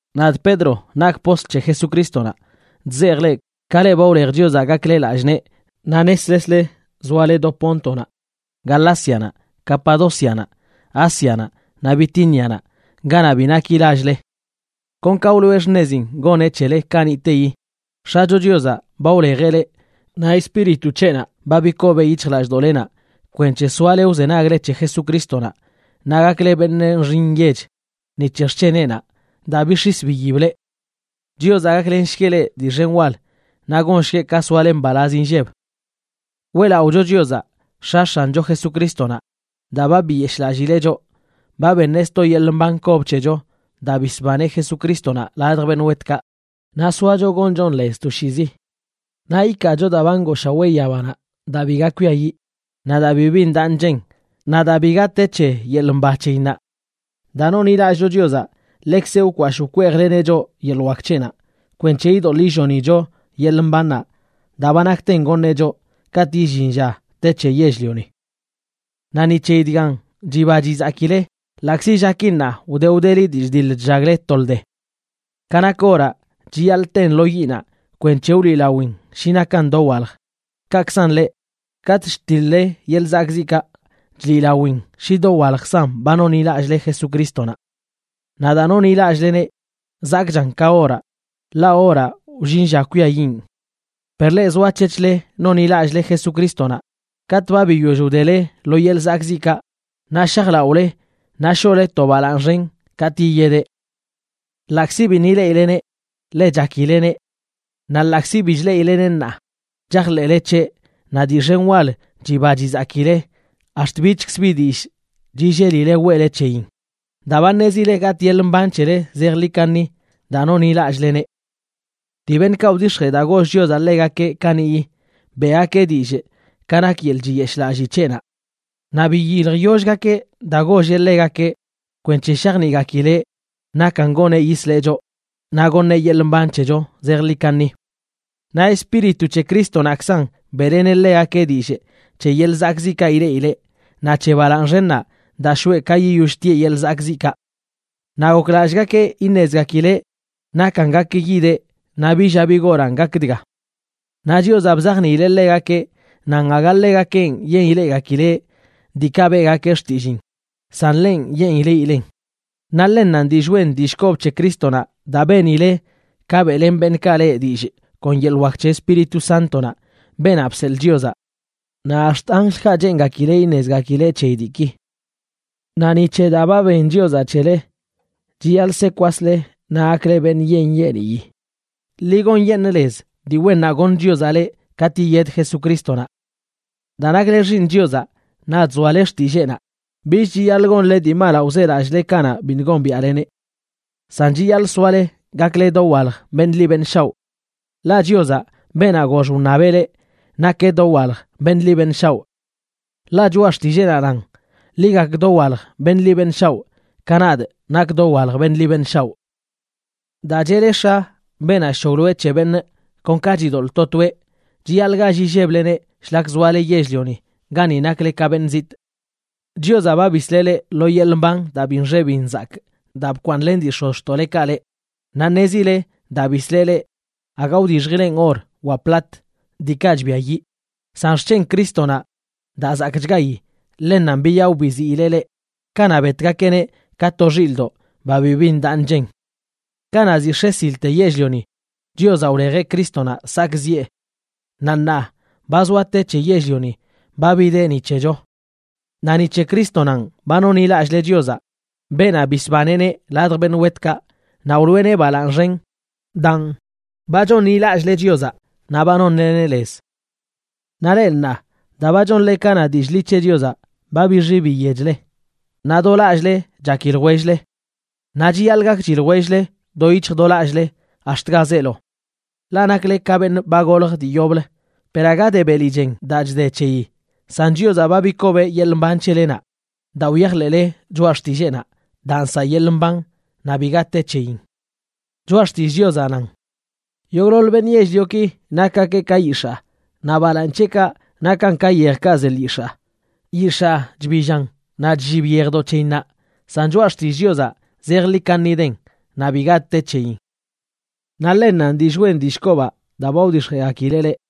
Nadꞌ Pedro nakꞌ postl c̱he Jesucrístonaꞌ, chzejꞌ leꞌ, ka leꞌ ba wlej Chiozaꞌ gakle lallꞌ nee naꞌ neslesle zoale do Póntonaꞌ, Galácianaꞌ, Capadócianaꞌ, Ásianaꞌ naꞌ Bitínianaꞌ, ganaꞌ bi naki lall-le. Kon ka wloꞌe xṉezin goneꞌ c̱hele kaniꞌteyi, X̱acho Chiozaꞌ ba wlejeꞌ leꞌ naꞌ Espíritu c̱heꞌnaꞌ ba bikobeꞌ yic̱hjlallꞌdoꞌlenaꞌ kwenc̱he soale wzenagle c̱he Jesucrístonaꞌ naꞌ gakle beṉꞌ nxi nyech ni c̱he xc̱heneꞌnaꞌ daa bix̱is biyib leꞌ. Chiozaꞌ gaklenshgueꞌ leꞌ dii xen wal naꞌ gonshgueꞌ ka soale mbalaz inlleb. Weꞌlaꞌocho Chiozaꞌ, X̱a X̱ancho Jesucrístonaꞌ. Daa ba biyeshꞌlallileꞌ choꞌ, ba beṉeꞌ sto yeḻꞌ mban kob c̱hecho daa bisbaneꞌ Jesucrístonaꞌ ladj beṉꞌ wetkaꞌ, naꞌ soacho gonchon lez toshiizi. Naꞌ ikaacho daa ba ngooshawee yabanaꞌ daa biga kwiayiꞌ, naꞌ daa bibi ndaꞌ nchen, naꞌ daa biga te c̱he yeḻꞌ mba c̱heyinnaꞌ. Daa nonḻilallꞌcho Chiozaꞌ ḻekzeꞌ wkwashꞌ wkweejleneꞌ choꞌ yeḻꞌ wak c̱heꞌnaꞌ kwenc̱he idoḻꞌ illonicho yeḻꞌ mbannaꞌ daa ba nakten goṉeꞌ choꞌ katꞌ illin lla te c̱he yell-lioni. Naꞌ ni c̱heyi dgan chiba chizakile, ḻaꞌkzi llaki ṉaa wde wdeli dii chdiḻ chllagle tolde. Ka nak oraꞌ, chiyaḻꞌ ten lo yiꞌnaꞌ kwenc̱he wliꞌlawin shi nakan dowalj. Kaꞌkzan leꞌ, katꞌ chtiḻ-le yeḻꞌ zakꞌziꞌkaꞌ chliꞌlawin shi dowaljkzan ba nonḻilallꞌle Jesucrístonaꞌ. Naꞌ daa nonḻilallꞌleneꞌ zakꞌchan ka oraꞌ, ḻaꞌ oraꞌ wllin lla kwiayiꞌn. Per leꞌ zoac̱hec̱hle nonḻilallꞌle Jesucrístonaꞌ, katꞌ ba biyoll wdele lo yeḻꞌ zakꞌziꞌkaꞌ, naꞌ shajlaꞌole naꞌ shoꞌle to balaaṉ xen katꞌ yiyedeꞌ. Ḻaꞌkzi biṉꞌ ileꞌileneꞌ, ḻe chakileneꞌ. Naꞌ ḻaꞌkzi bi chleꞌileneꞌ ṉaa, chajḻeꞌle c̱heꞌ naꞌ dii xen wal chiba chizakile ax̱t bichkz bi dillꞌ chillelile weꞌle c̱heyin, daa ba ṉezile gatꞌ yeḻꞌ mban c̱hele zejḻi kaṉi daa nonḻilallꞌleneꞌ. Dii beṉꞌkaꞌ wdix̱jee daa goll Chiozaꞌ ḻegakeꞌ kaniꞌyi, beꞌgakeꞌ dillꞌ ka nak yeḻꞌ chiyeshꞌlalli c̱heꞌnaꞌ. Naꞌ biyiljyollgakeꞌ daa golleꞌ ḻegakeꞌ kwenc̱he shajniꞌgakileꞌ nakan goneꞌ yisleꞌ choꞌ naꞌ goṉeꞌ yeḻꞌ mban c̱hecho zejḻi kaṉi. Naꞌ Espíritu c̱he Crístonaꞌkzan beꞌleneꞌ ḻegakeꞌ dillꞌ c̱he yeḻꞌ zakꞌziꞌkaꞌ ileꞌileꞌ naꞌ c̱he balaaṉ xennaꞌ daa shoꞌe ka yiyoll tieꞌ yeḻꞌ zakꞌziꞌkaꞌ. Naꞌ goklallꞌgakeꞌ iṉezgakileꞌ nakan gak yideꞌ naꞌ bi lla bi goranꞌ gak dga. Naꞌ Chiozaꞌ bzajniileꞌ ḻegakeꞌ nan aga ḻegakenꞌ yen ileꞌgakileꞌ diikaꞌ beꞌgakeꞌ xtilliin, san lenꞌ yen ileꞌilen. Naꞌ ḻennanꞌ dillꞌ wen dillꞌ kob c̱he Crístonaꞌ daa benile ka beꞌlen beṉꞌkaꞌ leꞌ dillꞌ kon yeḻꞌ wak c̱he Espíritu Sántonaꞌ, beenaꞌ bseḻꞌ Chiozaꞌ. Naꞌ ax̱t anjlkaꞌ cheengakileꞌ iṉezchgakileꞌ c̱heyi diiki. Naꞌ ni c̱he daa ba ben Chiozaꞌ c̱hele, chiyaḻꞌ se kwasle naꞌ gakle beṉꞌ nyeeṉ nyeeniyi. Ḻi gonyeṉꞌ lez dii wennaꞌ goṉ Chiozaꞌ leꞌ katꞌ yiyed Jesucrístonaꞌ. Daa nakle xiiṉ Chiozaꞌ naꞌ chzoale xtilleenaꞌ, bich chiyaḻꞌ gonle dii malaꞌ wzelallꞌle kanaꞌ biṉꞌ gombiaꞌleneꞌ. San chiyaḻꞌ soale gakle dowalj beṉꞌ ḻi beṉꞌ shaoꞌ. Ḻaꞌ Chiozaꞌ, beenaꞌ gox wṉabeꞌ leꞌ, nakeꞌ dowalj beṉꞌ ḻi beṉꞌ shaoꞌ. Ḻaꞌ Choꞌa Xtilleenaꞌ nan: “Ḻi gak dowalj beṉꞌ ḻi beṉꞌ shaoꞌ, ka nadꞌ nakꞌ dowalj beṉꞌ ḻi beṉꞌ shaoꞌ.” Daa cheꞌle “X̱a”, beenaꞌ chc̱hoglo c̱he beṉꞌ kon ka chidoḻꞌ to toeꞌ, chiyaḻꞌ gall illebleneꞌ shlak zoale yell-lioni gani nakle ka beṉꞌ zitꞌ. Chiozaꞌ ba bisleꞌ leꞌ lo yeḻꞌ mban daa bi nxe bi nzakꞌ daa bkwaaṉlen dii x̱ozxtoꞌlekaꞌ leꞌ. Naꞌ ṉezile daa bisleꞌ leꞌ aga wdixjileꞌn or wa plat, diikaꞌ chbiayiꞌ, san xc̱hen Crístonaꞌ daa zakꞌchgayi, ḻennanꞌ biyaꞌo biziileꞌ leꞌ kanaꞌ betgakeꞌneꞌ ka to xilꞌdoꞌ ba bibi ndaꞌ nchen. Kanaꞌ ziꞌ x̱e silte yell-lioni, Chiozaꞌ wlejeꞌ Crístonaꞌ sakꞌziꞌe. Naꞌ ṉaa ba zoa te c̱he yell-lioni ba bideꞌ ni c̱hecho. Naꞌ ni c̱he Crístonanꞌ ba nonḻilallꞌle Chiozaꞌ, beenaꞌ bisbaneꞌneꞌ ladj beṉꞌ wetkaꞌ naꞌ wloꞌeneꞌ balaaṉ xen. Daan, ba chonḻilallꞌle Chiozaꞌ naꞌ ba nonleneꞌ lez. Naꞌ leꞌ ṉaa, daa ba chonle ka na dillꞌ ḻi c̱he Chiozaꞌ ba bixi biyechle, naꞌ do lallꞌle chaki ljwell-le. Naꞌ chiyaḻꞌ gakchi ljwell-le do yic̱hj do lallꞌle ax̱t ga zeelo. Ḻaꞌ nakle ka beṉꞌ ba golj dii yoblə, per aga de beli chen daa chde c̱heyi, san Chiozaꞌ ba bikobeꞌ yeḻꞌ mban c̱helenaꞌ daa wyajḻeꞌle choꞌa xtilleenaꞌ daa nsaꞌ yeḻꞌ mban naꞌ biga te c̱heyin. Choꞌa Xtillꞌ Chiozaꞌ nan: Yogꞌḻoḻ beṉꞌ yell-lioki nakgakeꞌ ka yix̱aa, naꞌ balaaṉ c̱heꞌkaꞌ nakan ka yejkaꞌ ze lyix̱aa. Yix̱aa chbillan naꞌ chllib yejdoꞌ c̱heyinnaꞌ, san choꞌa xtillꞌ Chiozaꞌ zejḻi kaṉi den, naꞌ biga te c̱heyin. Naꞌ ḻennanꞌ dillꞌ wen dillꞌ kobaꞌ daa ba wdix̱jeꞌgakileꞌ leꞌ.